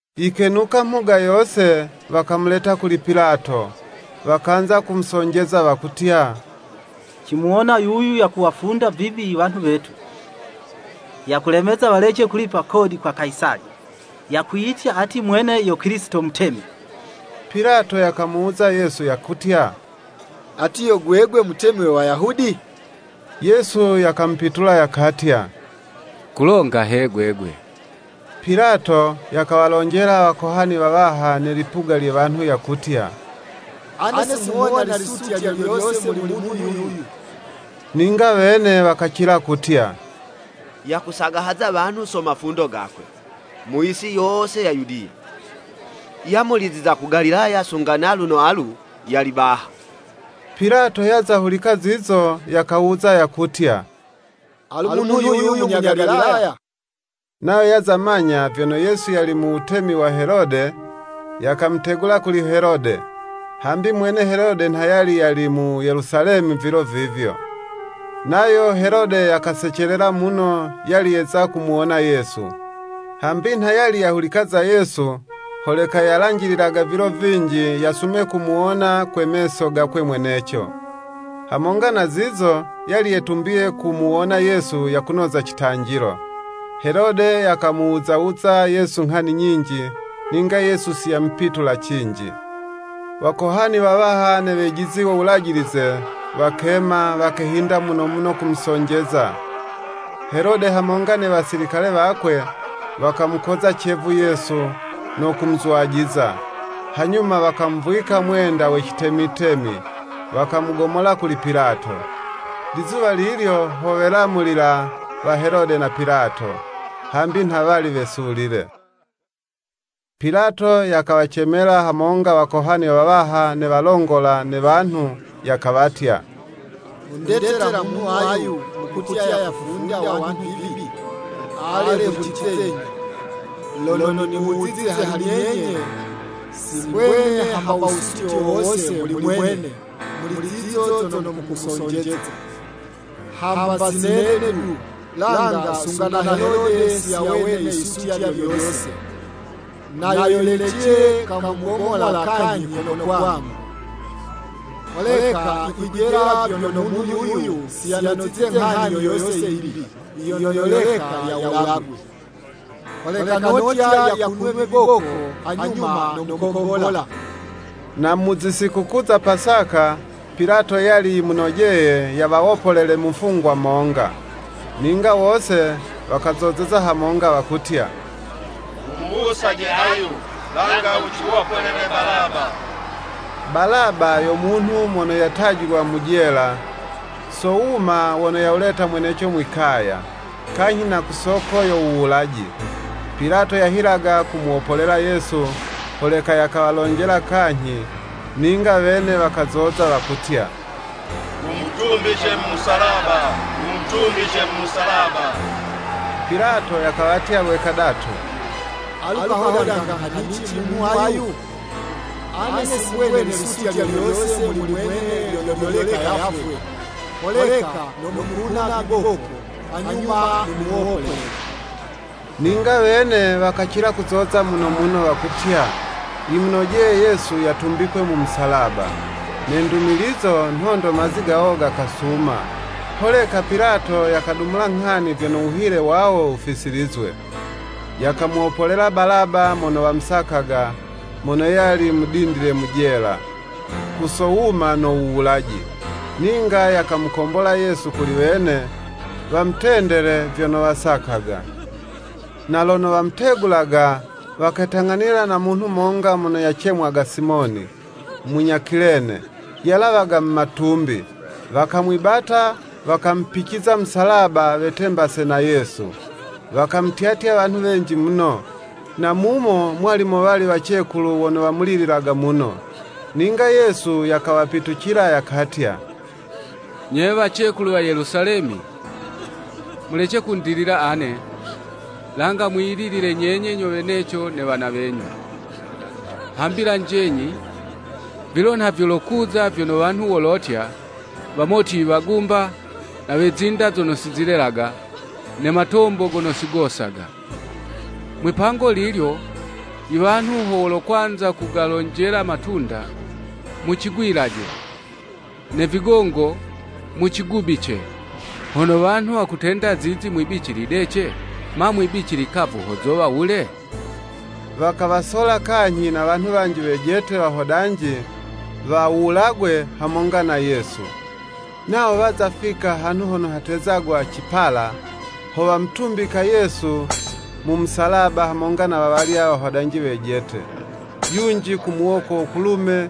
Yikenuka mhuga yose, wakamuleta kuli Pilato. Wakanza kumusonjeza, wakutya, “Cimuwona yuyu yakuwafunda vibi i wanhu wetu, yakulemeza walece kulipa kodi kwa Kayisali, yakwiyitya ati mwene yo Kilisito Mutemi.” Pilato yakamuwuza Yesu yakutya, “Ati, yo gwegwe Mutemi we Wayahudi?” Yesu yakamupitula, yakatya, “Kulonga he gwegwe.” Pilato yakawalonjela Wakohani wawaha ne lipuga lye wanhu yakutya, “Ane singhuwona lisutya lyo lyose muli munhu yuyu.” Ninga wene wakacila kutya, “Yakusagahaza wanhu so mafundo gakwe, mu yisi yose ya Yudiya, yamuliziza ku Galilaya sunga naluno alu, yali baha.” Pilato yaza hulika zizo yakawuza yakutya, “Alu munhu yuyu munya Galilaya?” Nayo yaza manya vyono Yesu yali mu wutemi wa Helode, yakamutegula kuli Helode, hambi mwene Helode nha yali yali mu Yelusalemi vilo vivyo. Nayo Helode yakasecelela muno yali yeza kumuwona Yesu, hambi nha yali yahulika za Yesu, holeka yalanjililaga vilo vinji, yasume kumuwona kwe meso gakwe mweneco. Hamonga na zizo, yali yetumbiye kumuwona Yesu yakunoza citanjilo. Helode yakamuwuzawuza Yesu nghani nyinji, ninga Yesu siyamupitula cinji. Wakohani wawaha ne wejizi wo Wulajilize, wakema, wakehinda muno muno kumusonjeza. Helode hamonga ne Wasilikale wakwe, wakamukoza cevu Yesu, no kumuzwajiza; hanyuma wakamuvwika mwenda we citemitemi, wakamugomola kuli Pilato. Lizuwa lilyo ho welamulila wa Helode na Pilato, hambi nha wali wesulile. Pilato yakawacemela hamonga Wakohani wawaha ne walongola ne wanhu, yakawatya, “Mundetela munhu ayu, mukutya, yakufunda wanhu vibi, ale hulicizenyi, lono nimuwuzize hali nyenye, si mbwene hamba wusutye wo wose muli mwene, muli zizo zono mukumusonjeza, hamba si nene du, langa sunga na Helode siyawene yisutya lyo lyose, na yo yilecile kamugomola kanyhi kono kwangu. Holeka yikwijela vyono munhu yuyu, si yanozize nghani yo yose yimbi, yono yoleka yawulagwe. Holeka notya yakunwe viboko, hanyuma nomukombola.” [ Na mu zi sikukuu za Pasaka, Pilato yali yimunojeye yawawopolele mufungwa monga.] Ninga wose wakazozeza hamonga, wakutya “Wumuwusaje ayu, langa wuciwopolele Balaba.” (Balaba yo munhu mono yatajilwa mu jela, so wuma wono yawuleta mweneco mwi'kaya, kanyhi na ku soko yo wuwulaji.) Pilato yahilaga kumuwopolela Yesu, holeka yakawalonjela kanyhi, ninga wene wakazoza, wakutya, “Wumutumbice mu musalaba, Wumutumbice mu musalaba!” Pilato yakawatya lwe kadatu, “Alu kahodanga nghanici munhu ayu? Ane si mbwene lisutya lyo lyose muli mwene lyono lyoleka yafwe, holeka nomukuna viboko, hanyuma nimuwopolele.” Ninga wene wakacila kuzoza muno muno, wakutya, yimunojeye Yesu yatumbikwe mu musalaba. Ne ndumilizo, nhondo mazi gawo gakasuma. Holeka Pilato yakadumula nghani vyono wuhile wawo wufisilizwe. Yakamuwopolela Balaba mono wamusakaga, mono yali mudindile mu jela, ku so wuma no wuwulaji, ninga yakamukombola Yesu kuli wene, wamutendele vyono wasakaga. Na lono wamutegulaga, waketang'anila na munhu monga mono yacemwaga Simoni, munya Kilene, yalawaga mu matumbi. Wakamwibata, wakamupiciza musalaba, wetembase na Yesu. Wakamutyatya wanhu wenji muno; na mumo mwali mowali wacekulu wono wamulililaga muno. Ninga Yesu yakawapitucila, yakatya, “Nye wacekulu wa Yelusalemi! Mulece kundilila ane, langa mwiyililile nyenye nyo weneco ne wana wenyu. Hambi lanjenyi, vilo nha vyolokuza vyono wanhu wolotya. ‘Wamoti iwagumba, na we zinda zono si zilelaga, ne matombo gono si gosaga.’ Mwipango lilyo i wanhu ho wolokwanza kugalonjela matunda, ‘Mucigwilaje.’ ne vigongo, ‘Mucigubice.’ Hono wanhu wakutenda zizi mwibici lidece, ma mwibici likavu ho zowa wule?” Wakawasola kanyhi na wanhu wanji wejete, wahodanji, wawulagwe hamonga na Yesu. Nawo waza fika hanhu hono hatezagwa, “Cipala,” ho wamutumbika Yesu mu musalaba hamonga na wawalya wahodanji wejete, yunji ku muwoko wo kulume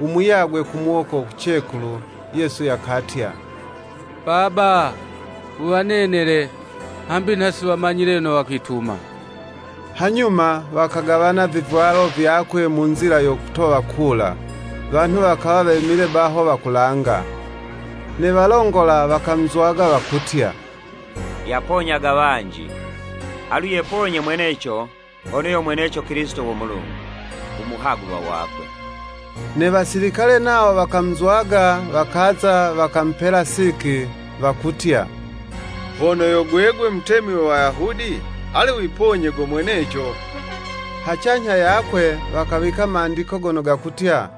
u muyagwe ku muwoko wo kucekulu. Yesu yakatya, “Baba, wuwanenele, hambi nha si wamanyile yono wakwituma. Hanyuma wakagawana vivwalo vyakwe mu nzila yo kutowa kula.” Wanhu wakawa wemile baho wakulanga. Ne walongola wakamuzwaga, wakutya, “Yaponyaga wanji, alu yeponye mweneco hono yo mweneco Kilisito wo Mulungu, u muhagulwa wakwe.” Ne wasilikale nawo wakamuzwaga, wakaza, wakamupela siki, wakutya, hono yo gwegwe Mutemi we Wayahudi, ale wiponye go mweneco. Hacanyha yakwe wakawika Mandiko gono gakutya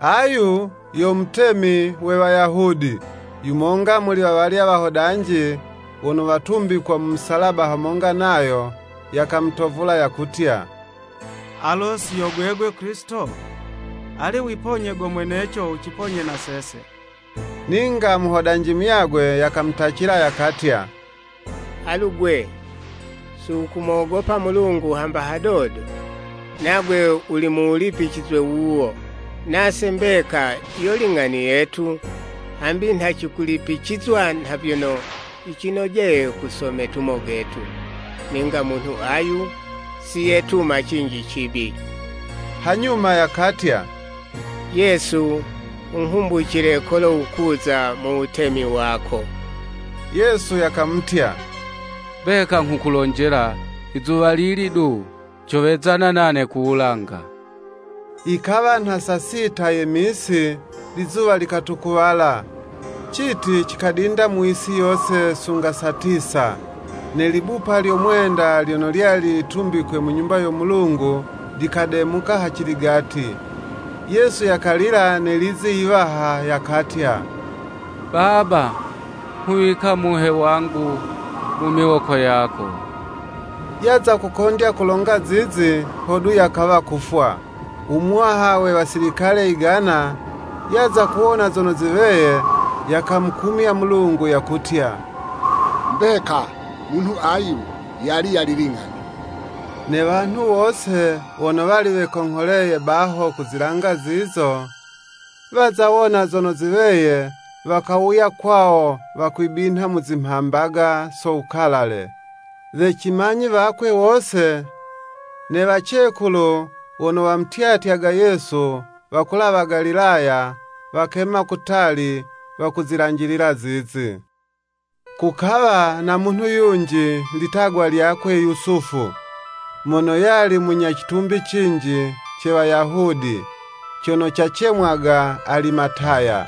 “Ayu yo Mutemi we Wayahudi.” Yu monga muli wawalya wahodanji, wono watumbikwa mu misalaba hamonga nayo, yakamutovula yakutya, “Alo si yo gwegwe Kilisito? Ale wiponye go mweneco, wuciponye na sese.” Ninga muhodanji muyagwe yakamutacila, yakatya, “Alu 'gwe, si wukumogopa Mulungu hamba hadodo? Nagwe wuli mu wulipicizwe wuwo. Nase mbeka yo ling'ani yetu, hambi nha cikulipicizwa nha vyono yicinojeye ku so metumo getu. Ninga Munhu ayu, siyetuma cinji cibi.” Hanyuma yakatya, “Yesu wunghumbucile kolo wukuza mu wutemi wako.” Yesu yakamutya, “Mbeka nghukulonjela, izuwalili du, cowezana nane ku Wulanga.” Yikawa nha saa sita ye misi, lizuwa likatukuwala, citi cikadinda mu yisi yose, sunga saa tisa, ne libupa lyo mwenda lyono lyali litumbikwe mu Nyumba yo Mulungu, likademuka haciligati. Yesu yakalila ne lizi yiwaha yakatya, “Baba, nghuwika muhe wangu mu Miwoko yako.” Yaza kukondya kulonga zizi, hodu yakawa kufwa. U muwaha we wasilikale yigana, yaza kuwona zono ziweye, yakamukumya Mulungu, yakutya, “Mbeka munhu ayu, yali yali ling'ani.” Ne wanhu wose wono wali wekongholeye baho kuzilanga zizo, waza wona zono ziweye, wakawuya kwawo wakwibinha mu zimhambaga so wukalale. We cimanyi wakwe wose, ne wacekulu wono wamutyatyaga Yesu wakulawa Galilaya, wakema kutali wakuzilanjilila zizi. Kukawa na munhu yunji litagwa lyakwe Yusufu, mono yali munya citumbi cinji, ce Wayahudi, cono cicemwaga Alimataya.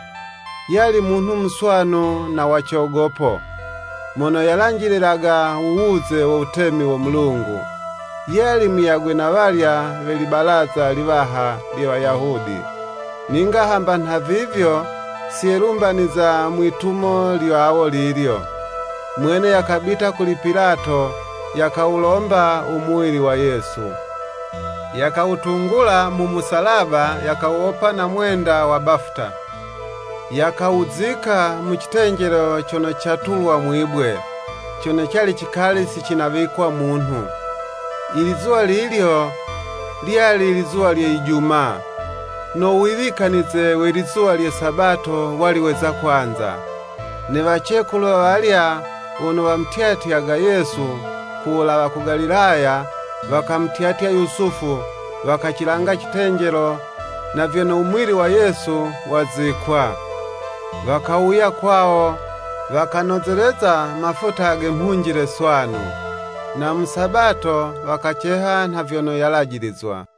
Yali munhu muswanu na wa cogopo. Mono yalanjililaga u wuze wo wutemi wo Mulungu. Yali muyagwe na walya we libalaza liwaha lye Wayahudi. Ninga hamba nhavivyo siyelumbaniza mwi'tumo lyawo lilyo. Mwene yakabita kuli Pilato yakawulomba u muwili wa Yesu. Yakawutungula mu musalaba, yakawuwopa na mwenda wa bafuta, yakawuzika mu citenjelo cono catulwa mwibwe, cono cali cikali sinawikwa munhu. Ilizuwa lilyo, lyali lizuwa lye Ijumaa, no wuwikanize we lizuwa lye Sabato wali weza kwanza. Ne wacekulu wawalya wono wamutyatyaga Yesu ku wulawa ku Galilaya, wakamutyatya Yusufu, wakacilanga citenjelo, na vyono u muwili wa Yesu wazikwa. Wakawuya kwawo, wakanozeleza mafuta ge mhunjile swanu. Na mu Sabato wakaceha nha vyono yalajilizwa.